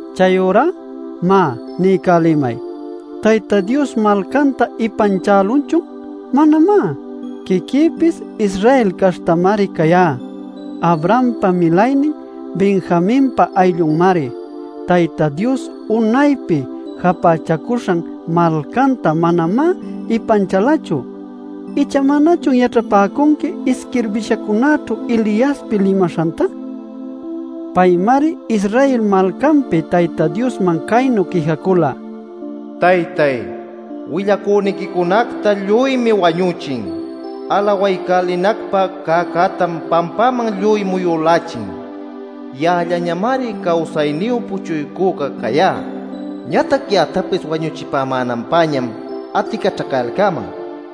Chayurá má, niycälimay: ¿Tayta Dios malcanta ipanchälunchun? ¡Manamá! Quiquïpis Israel caśhtamari cayá, Abrahampa milaynin, Benjaminpa ayllunmari. Tayta Dios unaypi japächaycuśhan malcanta manamá ipanchalachu. ¿Icha manachun yaćhapäcunqui isquirbishancunaćhu Eliaspi limaśhanta? Paymari Israel malcanpi Tayta Diosman caynu quijacula: “Taytay, willacüniquicunacta lluymi wañüchin, alawaycälinacpä cäcätam pampaman lluy muyülächin. Ya'allañamari cawsayniyu puchuycüca cayá. Ñatac ya'actapis wañuchipämänanpäñam aticaćhacayalcäman” nil.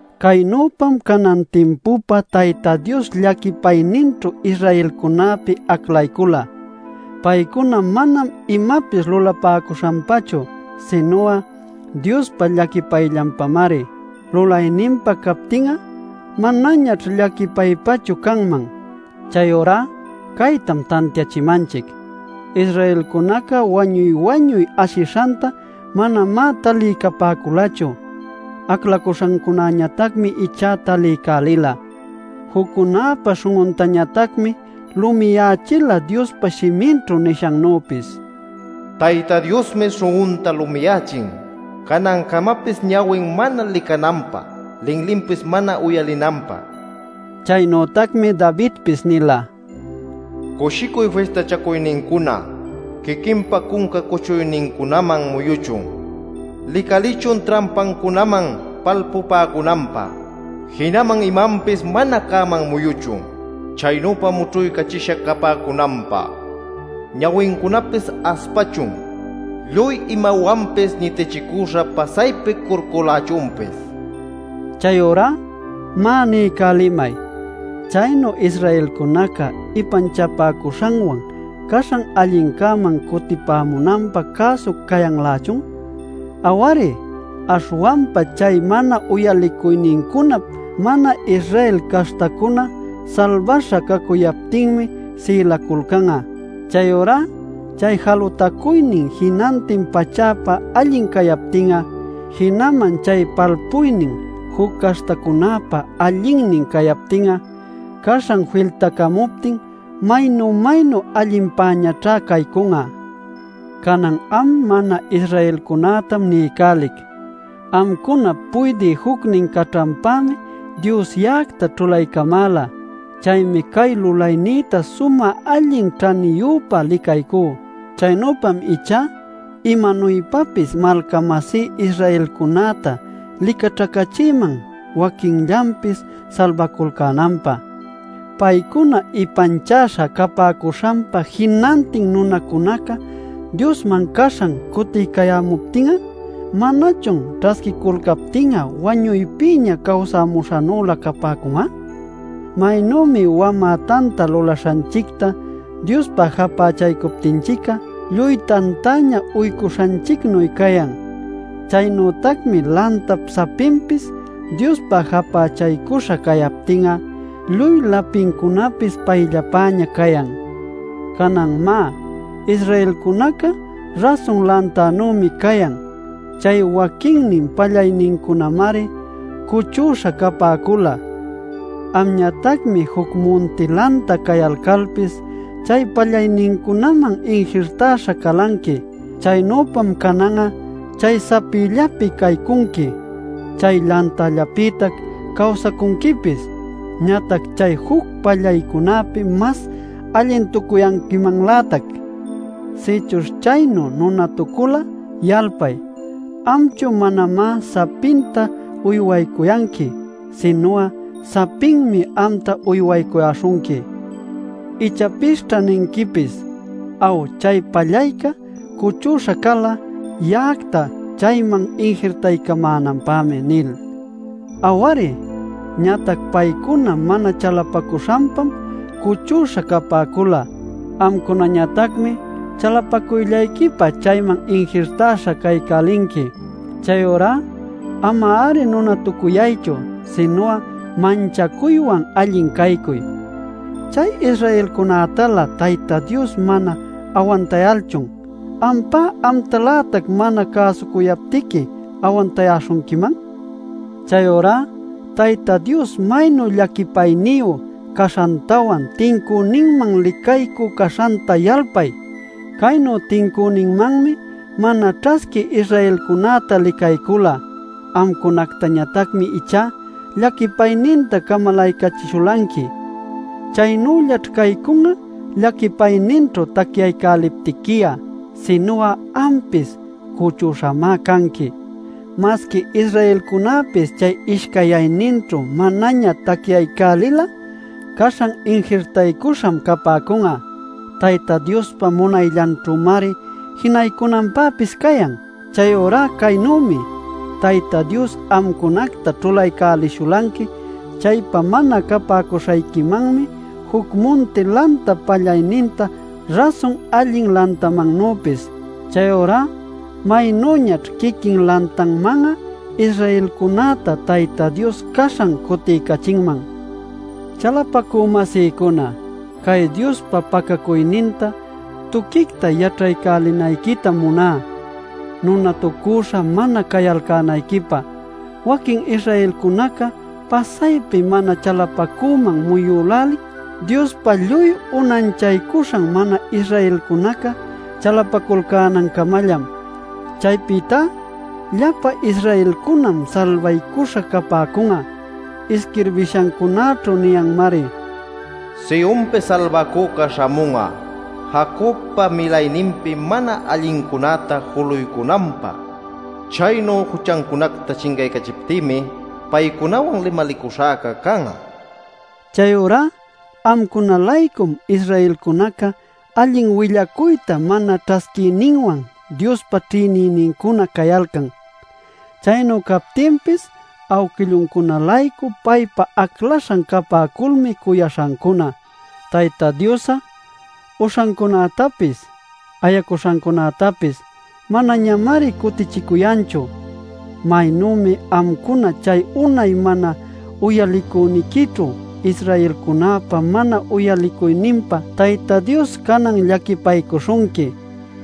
Caynüpam canan timpupä Tayta Dios llaquipayninćhu Israelcunäpi aclaycula. Paycuna manam imapis lulapäcuśhanpachu, sinu'a Diospa llaquipayllanpamari. Lulayninpa captin'a manañaćh llaquipaypachu canman. Chayurá caytam tantiachimanchic: Israelcunaca wañuy-wañuy ashishanta manamá taliycapäculachu. Aclaśhancunäñatacmi ichá taliycälila. Juccunäpa śhun'untañatacmi lumiyächila Diospa shiminćhu nishannüpis: “Tayta Diosmi śhun'unta lumiyächin, canancamapis ñawin mana licananpä, linlinpis mana uyalinanpä” nil. Chaynütacmi Davidpis nila: “Cushicuy fistachacuynincuna quiquinpa cunca cuchuynincunaman muyuchun, licalichun trampancunaman palpupäcunanpä. Jinaman imanpis mana cäman muyuchun, chaynüpa mućhuycachisha capäcunanpä. Ñawincunapis aspachun; lluy imawanpis ñitichicüśha pasaypi curculächunpis” nil. Chayurá má, niycälimay: ¿Chaynu Israelcunaca ipanchapäcuśhanwan caśhan allincäman cutipämunanpä cäsu cayanlächun? ¡Aw-ari! Aśhwanpa chay mana uyalicuynincunap mana-Israel caśhtacuna salbaśha cacuyaptinmi sïlaculcan'a. Chayurá chay jalutacuynin jinantin pachäpä allin cayaptin'a, jinaman chay palpuynin juc caśhtacunäpä allinnin cayaptin'a, ¡caśhan filtacamuptin maynu-maynu allinpäñaćhá caycun'a! Canan am mana-Israelcunätam niycälic: Amcunap puydï jucnin caćhanpämi Dios ya'acta ćhulaycamäla. Chaymi cay lulaynïta sumä allin ćhaniyüpä licaycú. Chaynüpam ichá imanuypapis malca-masí Israelcunäta licaćhacächïman waquinllanpis salbaculcänanpä. Paycuna ipanchäśha capäcuśhanpa jinantin nunacunaca Diosman caśhan cutiycayämuptin'a ¿manachun ćhasquiculcaptin'a wañuypïña cawsamuśhannülä capäcun'a? Maynümi wamä tanta lulaśhanchicta Diospä japächaycuptinchic'a lluy tantaña uycuśhanchicnuy cayan, chaynütacmi lantap sapinpis Diospä japächaycuśha cayaptin'a lluy lapincunapis payllapäña cayan. Canan má, Israelcunaca rasun lantanümi cayan. Chay waquinnin pallaynincunämari cuchüśha capäcula; amñatacmi juc munti lanta cayalcalpis chay pallaynincunaman injirtäśha calanqui. Chaynüpam canan'a chay sapillapi caycunqui, chay lantallapïtac cawsacunquipis. Ñatac chay juc pallaycunäpi mas allintucuyanquimanlätac. Sïchuśh chaynu nunatucul'a yalpay, amchu manamá sapinta uywaycuyanqui, sinu'a sapinmi amta uywaycuyäśhunqui. Ichapisćha ninquipis: “Aw, chay pallayca cuchüśha cala, ya'acta chayman injirtaycamänanpämi” nil. Aw-ari. Ñatac paycuná mana chalapacuśhanpam cuchüśha capäcula. Amcunañatacmi chalapacuyllayquipa chayman injirtäśha caycälinqui. Chayurá ama-ari nunatucuyaychu, sinu'a manchacuywan allin caycuy. ¿Chay Israelcunätalä Tayta Dios mana awantayalchun, ampá amtalätac mana cäsuyaptiqui awantayäśhunquiman? Chayurá Tayta Dios maynu llaquipayniyu caśhantawan tincüninman licaycü caśhanta yalpay. Caynu tincüninmanmi mana ćhasquï Israelcunäta licaycula; amcunactañatacmi ichá llaquipayninta camalaycachishulanqui. Chaynüllaćh caycun'a llaquipayninćhu tacyaycäliptiqui'a. Sinu'a ampis cuchüśhamá canqui. Masqui Israelcunäpis chay ishcayyayninćhu manaña tacyaycälil'a caśhan injirtaycuśham capäcun'a; Tayta Diospa munayllanćhümari jinaycunanpäpis cayan. Chayurá caynümi: Tayta Dios amcunacta ćhulaycälishulanqui chaypä mana capäcuśhayquimanmi juc munti lantap pallayninta rasun allin lantamannüpis. Chayurá ¡maynüñaćh quiquin lantanman'a Israelcunäta Tayta Dios caśhan cutiycachinman! Chalapacü-masïcuna, cay Diospa pacacuyninta tuquicta yaćhaycälinayquitam muná, nunatucüśha mana cayalcänayquipä: waquin Israelcunaca pasaypi mana chalapacüman muyülälin Diospa lluy unanchaycuśhan mana-Israelcunaca chalapaculcänancamallam. Chaypïtá llapa Israelcunam salbaycuśha capäcun'a. Isquirbishancunaćhu niyanmari: “Sionpi Salbacüca śhamun'a, Jacobpa milayninpi mana allincunäta juluycunanpä. Chaynu juchancunacta chincaycachiptïmi paycunawan limalicuśhäca can'a” nil. Chayurá amcuna-laycum Israelcunaca allin willacuyta mana ćhasquiyninwan Diospa ćhïnicünincuna cayalcan. Chaynu captinpis awquilluncuna-laycu paypa aclaśhan capäculmi cuyaśhancuna. Tayta Dios'a uśhancunätapis ayacuśhancunätapis manañamari cutichicuyanchu. Maynümi amcuna chay unay mana uyalicuyniquićhu Israelcunäpa mana uyalicuyninpa Tayta Dios canan llaquipaycuśhunqui,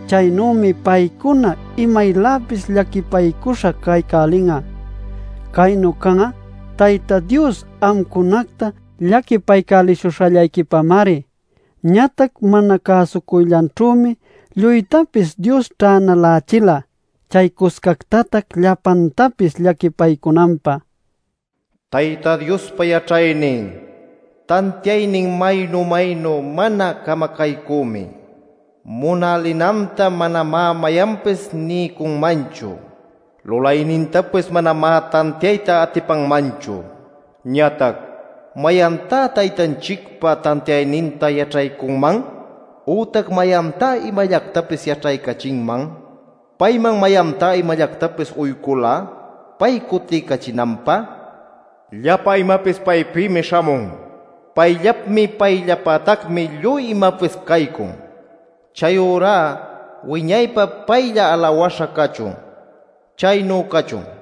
chaynümi paycuna imayläpis llaquipaycuśha caycälin'a. Caynu can'a Tayta Dios amcunacta llaquipaycälishuśhallayquipamari. Ñatac mana cäsucuyllanćhümi lluytapis Dios'a ćhänalächila chaycuscactatac llapantapis llaquipaycunanpä. ¡Tayta Diospa yaćhaynin, tantiaynin maynu-maynu mana camacaycümi! ¡Munalinanta manamá mayanpis niycunmanchu; lulaynintapis manamá tantiayta atipanmanchu! Ñatac “¿Mayantá Taytanchicpa tantiayninta yaćhaycunman? ¿Ütac mayantá imallactapis yaćhaycachinman?” “¿Payman mayantá imallactapis uycula, pay cutiycachinanpä?” Llapa imapis paypïmi śhamun. Payllapmi, payllapätacmi lluy imapis caycun. Chayurá ¡wiñaypä paylla alawäśha cachun! Chaynu cachun.